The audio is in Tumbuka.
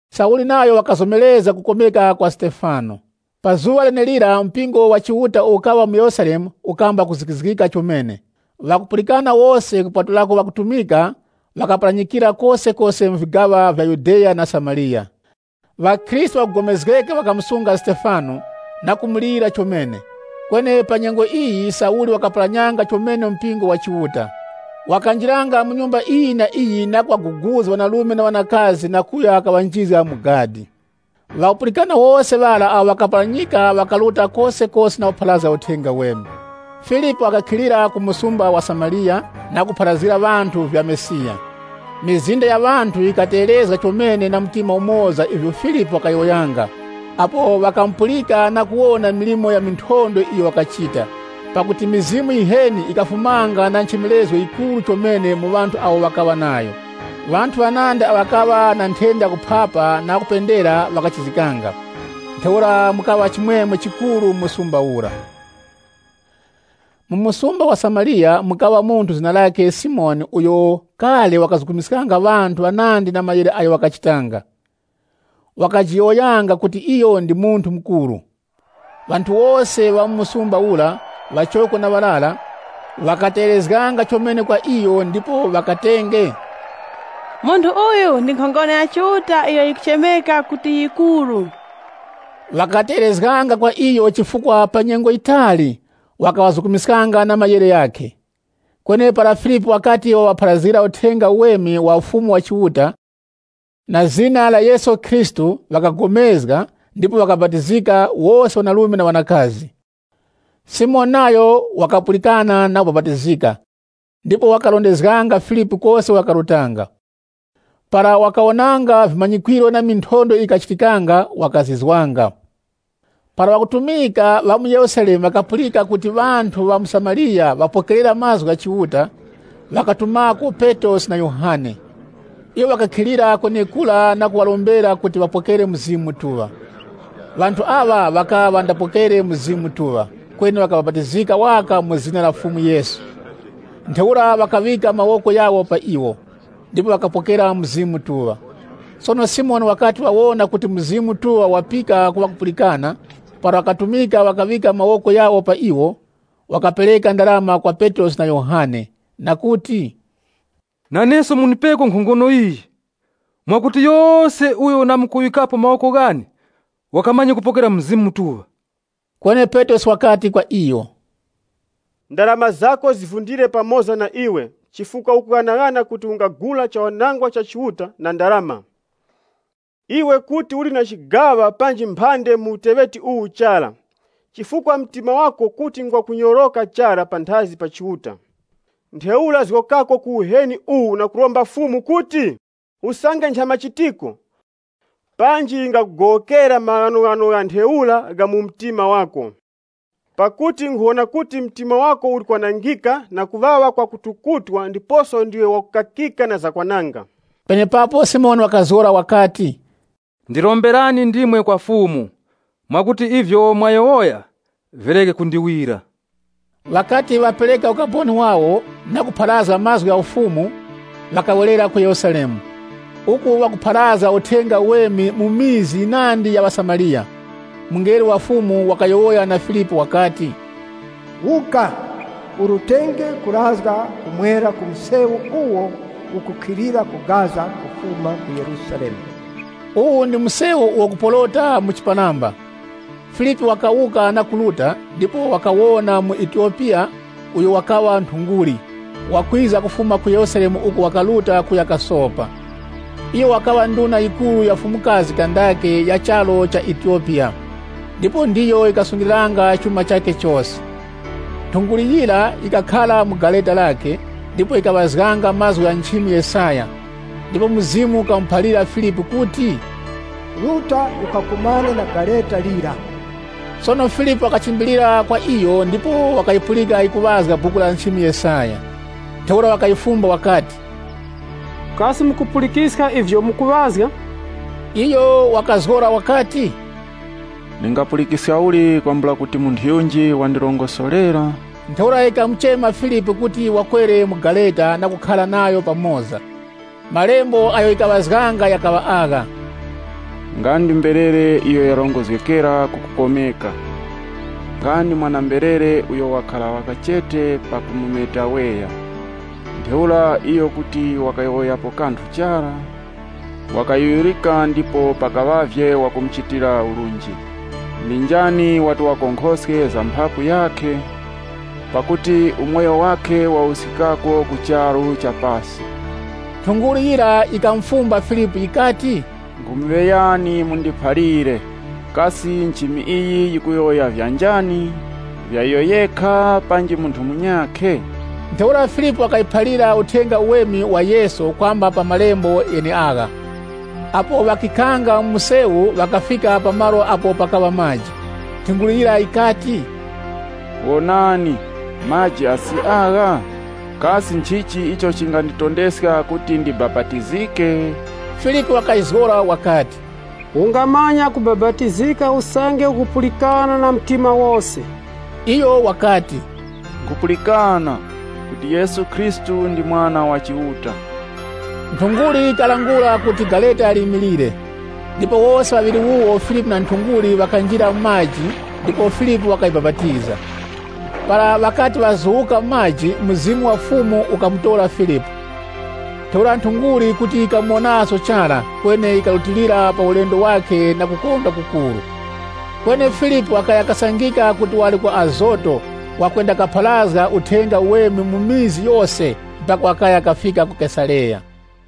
Sauli nayo wakazomerezga kukomeka kwa Stefano. Sauli wakuzikizga mpingo Pa zuŵa lenelira mpingo wa Chiuta uwo ukaŵa mu Yerusalemu ukamba kuzikizgika chomene. Ŵakupulikana wose, kupatulako ŵakutumika ŵakaparanyikira kosekose mu vigaŵa vya Yudeya na Samariya. Ŵakhristu ŵakugomezgeka ŵakamusunga Stefano, na kumulira chomene. Kweni pa nyengo iyi Sauli wakaparanyanga chomene mpingo wa Chiuta. Wakanjiranga mu nyumba iyi na iyi na kuŵaguguza ŵanarume na ŵanakazi na kuya kaŵanjizga mu gadi. Ŵakupulikana wose ŵara awo ŵakaparanyika ŵakaruta kosekose na kupharazga Uthenga Uweme. Filipu wakakhilira ku msumba wa Samariya na kupharazgira ŵanthu vya Mesiya. Mizinda ya ŵanthu yikategherezga chomene na mtima umoza ivyo Filipu wakayowoyanga, apo ŵakamupulika na kuwona milimo ya minthondwe iyo wakachita. Pakuti mizimu yiheni yikafumanga na nchemerezgo yikuru chomene mu ŵanthu awo ŵakaŵa nayo. Ŵanthu ŵanandi awo ŵakaŵa na nthenda yakuphapa na ŵakupendera ŵakachizgikanga. Ntheura mukaŵa chimwemwe chikuru mu msumba ura. Mu msumba wa Samariya, mukaŵa munthu zina lakhe Simoni uyo kale wakazukumiskanga ŵanthu ŵanandi na kuwukwa uko wakachitanga. Wakajiyowoyanga kuti iyo ndi munthu mukuru. Ŵanthu wose ŵa mu msumba ura, ŵachoko na ŵarara, ŵakategherezganga chomene kwa iyo ndipo ŵakatenge, “Munthu uyu ndi nkhongono ya Chiuta iyo yikuchemeka kuti ‘Yikuru.’” Ŵakategherezganga kwa iyo chifukwa pa nyengo yitali wakaŵazukumiskanga na kuwukwa kwakhe. Kweni para Filipu wakati waŵapharazgira Uthenga Uweme wa Ufumu wa Chiuta, na zina la Yesu Khristu, ŵakapulikana ndipo ŵakabapatizika, wose ŵanarume na ŵanakazi. Simoni nayo wakapulikana na kubapatizika, ndipo wakarondezganga Filipu kose uko wakarutanga. Para wakawonanga vimanyikwiro na minthondwe iyo yikachitikanga, wakazizwanga. Para ŵakutumika ŵa mu Yerusalemu ŵakapulika kuti ŵanthu ŵa ku Samariya ŵapokerera mazgu gha Chiuta, ŵakatumako Petrosi na Yohane. Iwo ŵakakhilira kwenekura na kuŵarombera kuti ŵapokere Mzimu Mutuŵa. Ŵanthu aŵa ŵakaŵa ŵandapokere Mzimu Mutuŵa, kweni ŵakabapatizika waka mu zina la Fumu Yesu. Ntheura ŵakaŵika mawoko ghawo pa iwo, ndipo ŵakapokera Mzimu Mutuŵa. Sono Simoni wakati wawona kuti Mzimu Mutuŵa ukapika ku ŵakupulikana, para ŵakutumika ŵakaŵika mawoko ghawo pa iwo, wakapereka ndarama kwa Petrosi na Yohane, na kuti, “Naneso mundipeko nkhongono iyi, mwakuti yose uyo ndamkuŵikapo mawoko ghane wakamanye kupokera Mzimu Mutuŵa.” Kweni Petrosi wakati kwa iyo, “Ndarama zako zivundire pamoza nawe chifukwa ukughanaghana kuti ungagula chawanangwa cha Chiuta na ndarama! Iwe kuti uli na chigaŵa panji phande mu uteŵeti uwu chara, chifukwa mtima wako kuti ngwa kunyoroka chara panthazi pa Chiuta. Ntheura zgokako ku uheni uwu na kuromba Fumu kuti, usange nchamachitiko, panji yingakugowokera maghanoghano gha ntheura gha mu mtima wako. Pakuti nkhuwona kuti mtima wako uli kwanangika na kuŵaŵa kwa kutukutwa ndiposo ndiwe wakukakika na zakwananga.” Penepapo Simoni wakazgora wakati, “Ndiromberani ndimwe kwa Fumu, mwakuti ivyo mwayowoya vireke kundiwira.” Ŵakati ŵapereka ukaboni wawo, na kupharazga mazgu gha Fumu, ŵakawerera ku Yerusalemu, uku ŵakupharazga Uthenga Uweme mu vikaya vinandi vya ŵaSamariya. Mungelo wa Fumu wakayowoya na Filipu wakati, “Wuka, urutenge kurazga ku mwera ku msewu uwo ukukhilira ku Gaza kufuma ku Yerusalemu.” Uwu ndi msewu uwo ukuporota mu chiparamba. Filipu wakawuka na kuruta, ndipo wakawona muEtiyopiya, uyo wakaŵa nthunguli, wakwiza kufuma ku Yerusalemu uko wakaruta kuya kasopa. Iyo wakaŵa nduna yikuru ya Fumukazi Kandake ya charu cha Etiyopiya, ndipo ndiyo yikasungiliranga chuma chakhe chose. Nthunguli yira yikakhara mu gareta lakhe, ndipo yikaŵazganga mazgu gha nchimi Yesaya. Ndipo Mzimu wakamuphalira Filipu kuti, “Ruta ukakumane na gareta lira.” Sono Filipu wakachimbilira kwa iyo ndipo wakayipulika yikuŵazga Buku la nchimi Yesaya. Ntheura wakayifumba wakati, “Kasi mukupulikiska ivyo mukuŵazga?” Iyo wakazgora wakati, “Ndingapulikiska uli kwambula kuti munthu yunji wandirongosorera?” Ntheura yikamuchema Filipu kuti wakwere mu gareta na kukhara nayo pamoza. Malembo agho yikaŵazganga ghakaŵa agha: “Nga ndi mberere iyo yarongozgekera ku kukomeka. Nga ndi mwana-mberere uyo wakhara waka chete pakumusenga weya. Ntheura iyo kuti wakajula mlomo wakhe chara. (LXX) Wakayuyurika ndipo pakaŵavye wakumuchitira urunji. Ndi njani wati wakonkhoske za mphapu yakhe? Pakuti umoyo wakhe wawuskikako ku charu cha pasi?” Nthunguli yira yikamufumba Filipu yikati, “Nkhumuŵeyani mundiphalire, kasi nchimi iyi yikuyowoya vya njani? Vya iyo yekha, panji munthu munyakhe?” Ntheura Filipu wakayiphalira Uthenga Uweme wa Yesu kwamba pa malembo gheneagha. Apo ŵakikhanga mu msewu ŵakafika pa malo apo pakaŵa maji. Nthunguli yira yikati, “Wonani, maji asi agha! Kasi nchichi icho chinganditondeska kuti ndibapatizike?” [ Filipu wakayizgora wakati, “Ungamanya kubapatizika usange ukupulikana na mtima wose.” Iyo wakati, “Nkhupulikana kuti Yesu Khristu ndi Mwana wa Chiuta.”] Nthunguli yikalangula kuti gareta limilire. Ndipo wose ŵaŵiri wuwo, Filipu na nthunguli, ŵakanjira mu maji ndipo Filipu wakayibapatiza. Para ŵakati ŵazuwuka mu maji, Mzimu wa Fumu ukamutora Filipu, ntheura nthunguli kuti yikamuwonaso chara, kweni yikarutilira pa ulendo wakhe na kukondwa kukuru. Kweni Filipu wakaya kasangika kuti wali ku Azoto, wakwendakapharazga Uthenga Uweme mu mizi yose, mpaka wakaya kafika ku Kesareya.